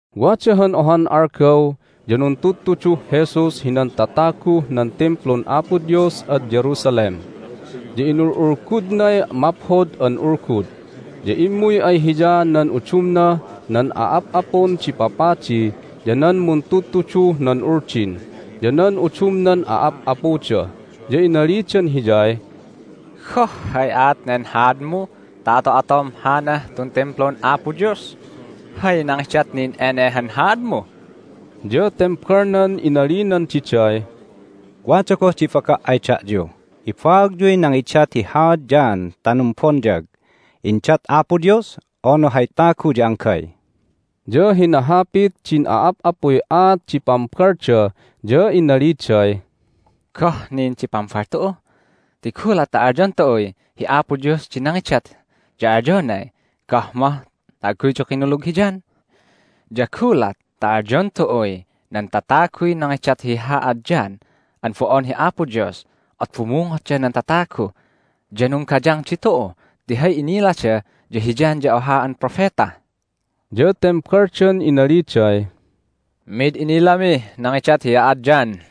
Wada han ohan algaw ya nuntudtuduh Jesus hinan tataguh nan Timplun Apo Dios ad Jerusalem, ya inul'ulgudnay Maphod an Ulgud. Ya immuy ay Hiya nan udumnah nan a'ap'apun di papadi, ya nan muntudtuduh nan Uldin, ya nan udumnan a'ap'apuda, ya inalidan Hiyay, "Goh hay aat nen haadmu ta ato'atom hanah tun Timplun Apo Dios? Hay nangidat nin ene han haadmu?" Ya tembalnan inalinan diday, "Wada goh di ibaga' ay da'yu: ibaagyuy nangidat hi haad John ta numbonyag. Indat Apo Dios, unu hay tagu ya anggay?" Ya hinahapit din a'ap'apuy aat di pambalda, ya inaliday, "Goh nin di pambal tu'u? Ti gulat ta alyon tu'uy, Hi Apo Dios di nangidat, ya alyonay, Goh mah ta agguyyu kinulug hi John? Ya gulat ta alyon tu'uy, Nan tataguy nangidat hi haad John an bo'on hi Apo Dios, at bumungotda nan tatagu, ya nunggayang ditu'u ti hay inilada ya hi John ya oha an propeta." Ya tembaldan inaliday, "Mid inilamih nangidat hi haad John."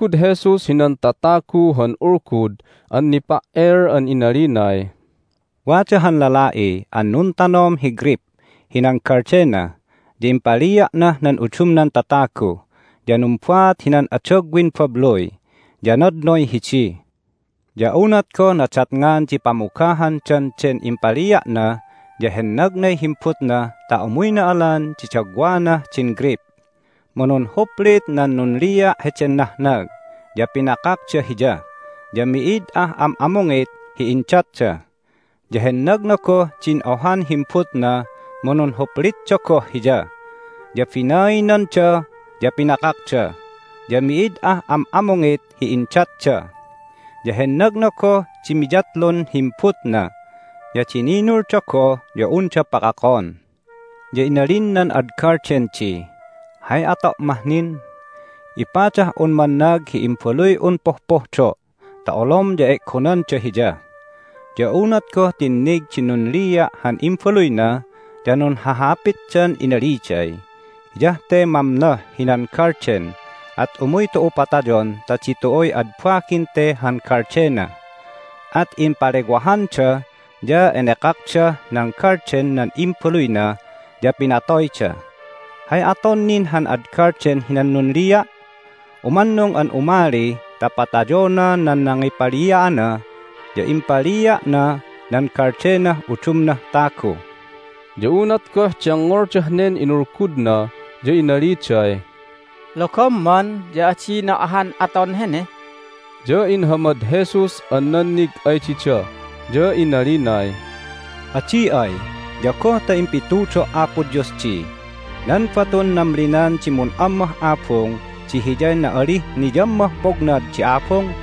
Inulgud Jesus hinan tatagu han ulgud an nipa"el an inalinay, "Wada han lala'i an nuntanom hi greyp hinan galdena, ya impalia'nah nan udumnan tatagu, ya numbaat hinan adagwin babluy, ya nadnoy hidi. Ya unat goh nadatngan di pamugahandan den impalia'na ya hennagnay himbutna ta umuyna alan di dagwanah din greyp. Mu nunhuplit nan nunlia' heden nahnag, ya pinakakda hiya, ya mi'id ah am'amungit hi indatda. Ya hennagna goh din ohan himbutna, mu nunhuplitda goh hiya, ya binainanda, ya pinakakda, ya mi'id ah am'amungit hi indatda. Ya hennagna goh di miyatlun himbutna, ya dininulda goh ya unda pakakon. Ya inalin nan ad galden di, Hay ato' mah nin? Ipadah'un mannag hi imbaluy'un pohpohdo' ta olom ya e'gonanda hiya. Ya unat goh tinnig din nunlia' han imbaluyna ya nunhahapitdan inaliday, Hiyah te mamnoh hinan galden, at umuy tu'u patayon ta ditu'uy ad bagin te han galdena! At impalewahanda, ya enekakdah, nan galden nan imbaluyna, ya pinatoyda. Hay aton nin han ad galden hinan nunlia'? Umannung an umali ta patayona nan nangipalia'ana, ya impalia'na nan galdenah udumnah tagu." Ya unat goh dengngoldah nen inulgudna ya inaliday, "Logomman ya adina ahan aton hene!" Ya inhamad Jesus an nannig ay dida, ya inalinay, "Adi ay ya goh ta impitudo' Apo Dios di, Nan batun namlinan di mun'ammah abung di hiyay na'alih niyammah pognad di abung?"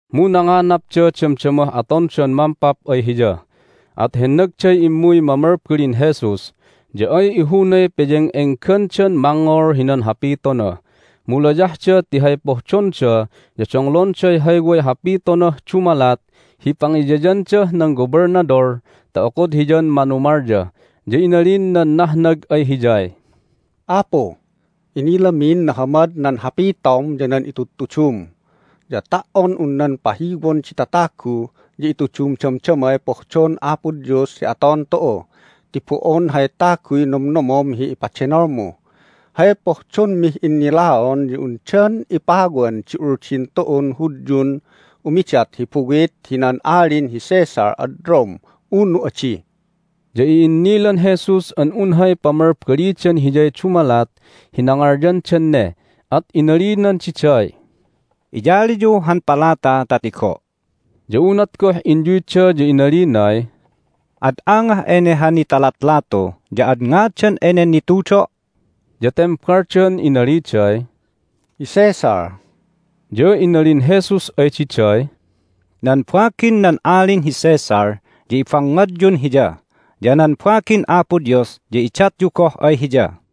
Mu nanganapda damdamah atondan mampap ay Hiya, at hennagday immuy mamalbalin Jesus, ya ay ihunay peyeng'enggandan mangngol hinan hapitona, mu layahda ti hay pohdonda ya donglonday hay way hapitonah dumalat hi pangiyayandah nan Gobelnadol ta okod hiyan manumalya. Ya inalin nan nahnag ay Hiyay, "Apu, inilamin nahamad nan hapitom ya nan itudtudum. Ya ta"on un nan pahiwon di tatagu ya itudum damdamay pohdon Apo Dios hi aton tu'u ti bo'on hay taguy nomnomom hi ipadenolmu. Hay pohdonmih innilaon ya undan ipawan di Uldin tu'un Hudyun umidat hi buwit hinan Alin hi Caesar ad Rome, unu adi?" Ya i'innilan Jesus an un hay pamalbalidan Hiyay dumalat hi nangalyandan ne, at inalinan diday, "Iyaliyu han palata ta tigo'." Ya unat goh inyuyda ya inalinay, "Ad angah ene han nitalatlatu, ya ad ngadan enen nitudo'?" Ya tembaldan inaliday, "Hi Caesar." Ya inalin Jesus ay diday, "Nan bagin nan Alin hi Caesar ya ibangngadyun hiya, ya nan bagin Apo Dios ya idatyu goh ay Hiya."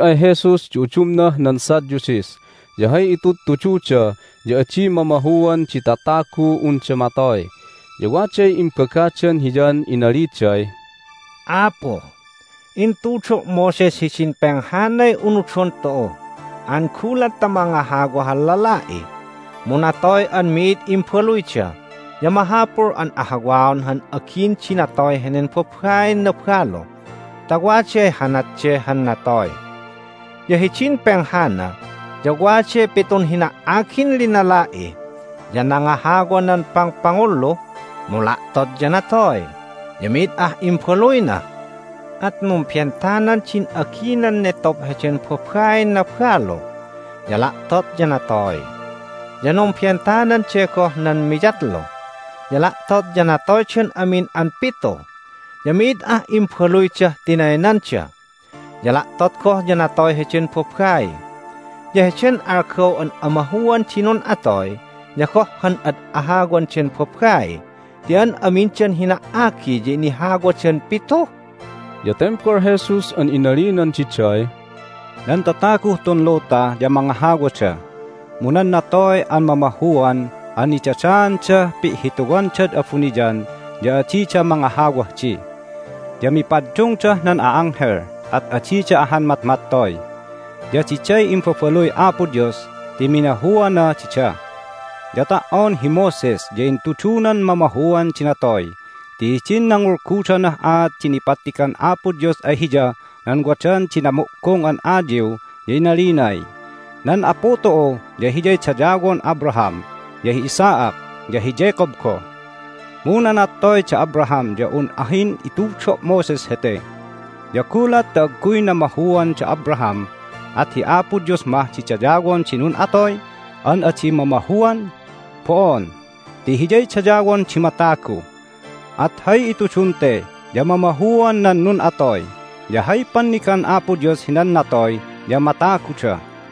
Immuy ay Jesus di udumnah nan Sadducees, ya hay itudtududa ya adi mamahuan di tataguh unda matoy. Ya waday imbagadan Hiyan inaliday, "Apu, intudo' Moses hidin penghanay unudon tu'u an gulat ta mangahawa han lala'i mu natoy an mi'id imbaluyda ya mahapul an ahawaon han agin di natoy henen babain nabalu ta waday hanat de han natoy. Ya hidin penghana ya waday pitun hina"agin linala'i, ya nangahawa nan pangpangullu, mu la'tot ya natoy, ya mi'id ah imbaluyna. At numbentanan din aginan netob heden babain nabalu, ya la'tot ya natoy. Ya numbentanan de goh nan miyatlu, ya la'tot ya natoydan amin an pitu, ya mi'id ah imbaluydah tinaynanda. Ya la'tot goh ya natoy heden babai. Ya heden algaw an amahuan di nun'atoy ya goh han ad ahawan den babai ti an amindan hina"agi ya inahawadan pitu?" Ya tembal Jesus an inalinan diday, "Nan tataguh tun luta ya mangahawada, mu nan natoy an mamahuan an nidadaandah pi'hituandad abuniyan ya adida mangahawah di. Ya mipaddungdah nan a'anghel, at adida ahan matmattoy. Ya diday imbabaluy Apo Dios ti minahuana dida. Ya ta"on hi Moses ya intudunan mamahuan di natoy ti hidin nangulgudanah aat di nipattigan Apo Dios ay hiyah nan wadan din namo'gong an ayiw ya inalinay, Nan Apu tu'u ya Hiyay dayawon Abraham, ya hi Isaac, ya hi Jacob goh. Mu nanattoy da Abraham ya un ahin itudo' Moses hete! Ya gulat ta agguy namahuan da Abraham at hi Apo Dios mah di dayawon di nun'atoy an adi mamahuan? Bo'on, ti Hiyay dayawon di matagu! At hay itudun te ya mamahuan nan nun'atoy. Ya hay pannigan Apo Dios hinan natoy ya mataguda."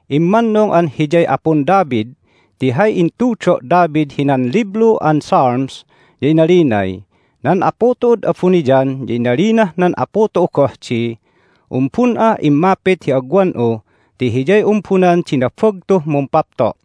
Immannung an Hiyay Apun David ti hay intudo' David hinan Liblu an Psalms ya inalinay, Nan Apu tu'ud abuniyan ya inalinah nan Apu tu'u goh di, Umbun'ah immapit hi agwan'u ti hiyay umbunan di nabagtuh mumpapto'.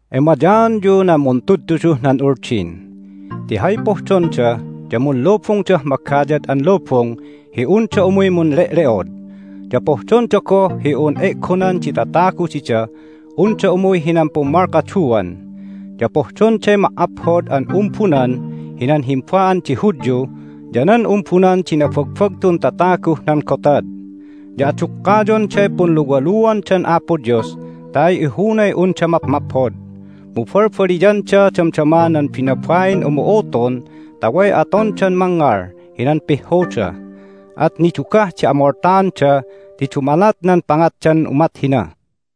"Emayaanyu nan muntudtuduh nan Uldin! Ti hay pohdonda ya munlubungdah magayad an lubung hi unda umuy munle'le'od, ya pohdonda goh hi un e'gonan di tatagu didah unda umuy hinan pummalkaduan, ya pohdonday ma"aphod an umbunan hinan himba'an di Hudyu ya nan umbunan di nabagbagtun tataguh nan gotad, ya adukkayonday punluwaluandan Apo Dios ta ay ihunay unda mapmaphod. Mu balbaliyanda damdama nan binabain umu'utun ta way atondan mangngal hinan pihhuda. At nidugah di amoltaanda ti dumalat nan pangatdan umat hina!"